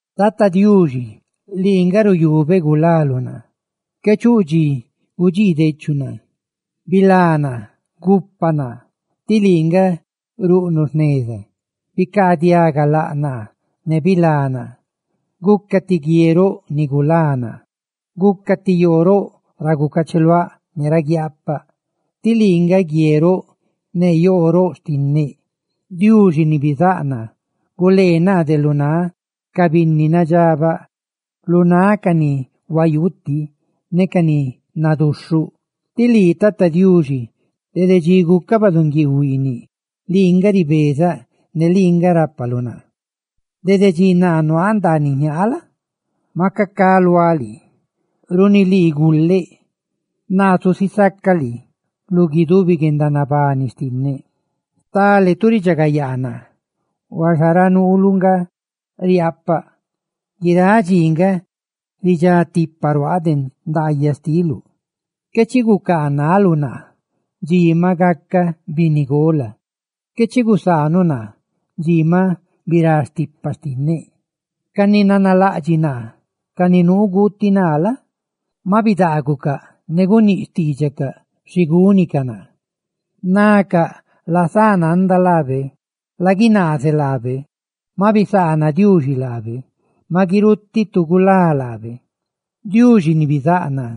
Tata Diuxi, lii nga ruyubeꞌ gulaluꞌ naa; ¡qué chuꞌ dxi gudxiidechuꞌ naa! ¡Bilá naa, gupa naa, tí lii nga ruꞌnuꞌ jneza! Bicaadiaga laꞌ naa, ne bilá naa. Guca ti guie roꞌ ni gulá naa, ¡guca ti yoo roꞌ ra gucacheluáꞌ ne ra guiaapaꞌ! ¡Tí lii nga guie roꞌ ne yoo roꞌ xtinneꞌ! Diuxi ni bizáꞌ naa, gulee naa de lu náꞌ ca binni nadxabaꞌ, lu náꞌ ca ni huayuutiꞌ ne ca ni naduxhuꞌ, tí lii, Tata Diuxi, dede dxi gucaꞌ baꞌdunguiiu huiiniꞌ, lii nga ribezaꞌ ne lii nga rápaluꞌ naa. Dede dxi naa nuaaꞌ ndaaniꞌ jñaa la? maca ca luáꞌ lii. ¡Runi lii guleꞌ! ¡Naa zusisacaꞌ lii lu guidubi guendanabani xtinneꞌ! Stale tu ridxagayaa naa, huaxa ra nuuluꞌ nga riaapaꞌ. Guiráꞌ dxi nga ridxá tipa ruaaꞌ de ndaayaꞌ xtiluꞌ; qué chi gucaanaluꞌ naa dxi maꞌ gaca binnigola; qué chi gusaanuꞌ naa dxi maꞌ birá stipa xtinneꞌ. Ca ni nanalaꞌdxiꞌ naa, ca ni nuu guuti naa la? maꞌ bidaagucaꞌ ne guníꞌ xtiidxacaꞌ xi gúnicaꞌ naa. Nacaꞌ: «¡Lazánanda laabe, laguinaazeꞌ laabe, maꞌ bisaana Diuxi laabe ne maꞌ guirutiꞌ tu gulá laabe!» Diuxi ni bizáꞌ naa,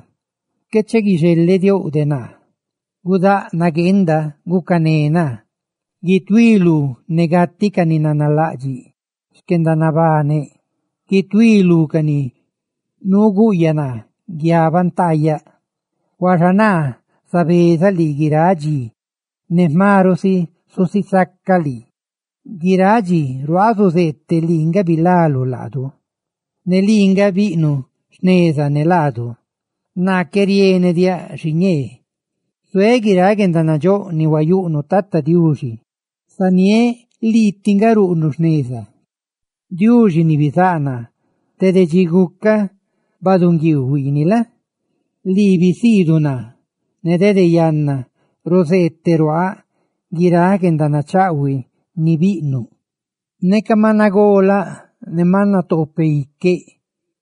qué chi guixelediouꞌ de naa; ¡gudáꞌ nagueenda gucané naa! ¡Guituí lú ne gatiꞌ ca ni nanalaꞌdxiꞌ xquendanabaneꞌ! ¡Guituí lú ca ni nuu guꞌyaꞌ naa guiabantaꞌyaꞌ! Huaxa naa zabezaꞌ lii guiráꞌ dxi, ne jma ruꞌ si zusisacaꞌ lii; guiráꞌ dxi ruaaꞌ zuzeeteꞌ lii nga bilaluꞌ laadu ne lii nga biꞌnuꞌ jneza ne laadu. ¡Naa qué rienediáꞌ xiñee! Zuéꞌ guiráꞌ guendanandxóꞌ ni huayuꞌnuꞌ Tata Diuxi; ¡zaniéꞌ lii tiꞌ nga ruꞌnuꞌ jneza! Diuxi ni bizáꞌ naa, dede dxi gucaꞌ baꞌdunguiiu huiiniꞌ la? lii bisiiduꞌ naa, ne dede yanna ruzeeteruáꞌ guiráꞌ guendanachaꞌhuiꞌ ni biꞌnuꞌ. Neca maꞌ nagolaꞌ ne maꞌ natoopeꞌ iqueꞌ,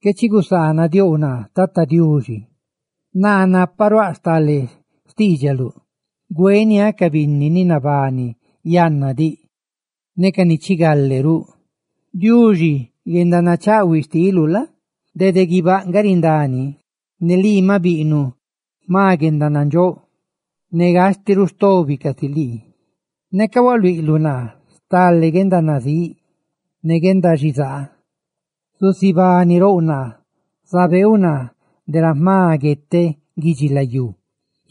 qué chi gusaanudiouꞌ naa Tata Diuxi, naa naparuáꞌ stale xtiidxaluꞌ güeniáꞌ ca binni ni nabani yanna diꞌ ne ca ni chigale ruꞌ. Guendanachaꞌhuiꞌ xtiluꞌ, ay Diuxi, dede guibáꞌ nga rindá ni; ne lii maꞌ biꞌnuꞌ jma guendanandxóꞌ; ¡ne gastiꞌ ruꞌ stobi casi lii! Neca hualuiꞌluꞌ naa stale guendanazíꞌ ne guendaxizaa, susibanirouꞌ naa; zabeeuꞌ naa de ra jma gueteꞌ guidxilayú,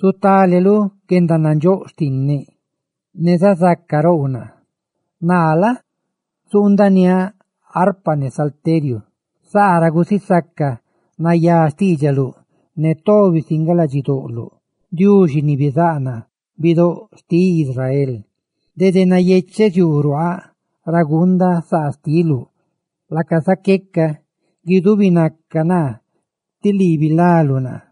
zutáleluꞌ guendanandxóꞌ xtinneꞌ ne zazaca rouꞌ naa. Ne naa la? zuundaniáꞌ arpa ne salteriu, saa ra gusisacaꞌ nayá xtiidxaluꞌ ne tobi si nga ladxidoꞌloꞌ, Diuxi ni bizáꞌ naa, bidóꞌ xtiꞌ Israel. Dede nayecheꞌ ziuu ruaaꞌ ra guundaꞌ saa xtiluꞌ, laca zaqueca guidubinaca naa, tí lii bilaluꞌ naa.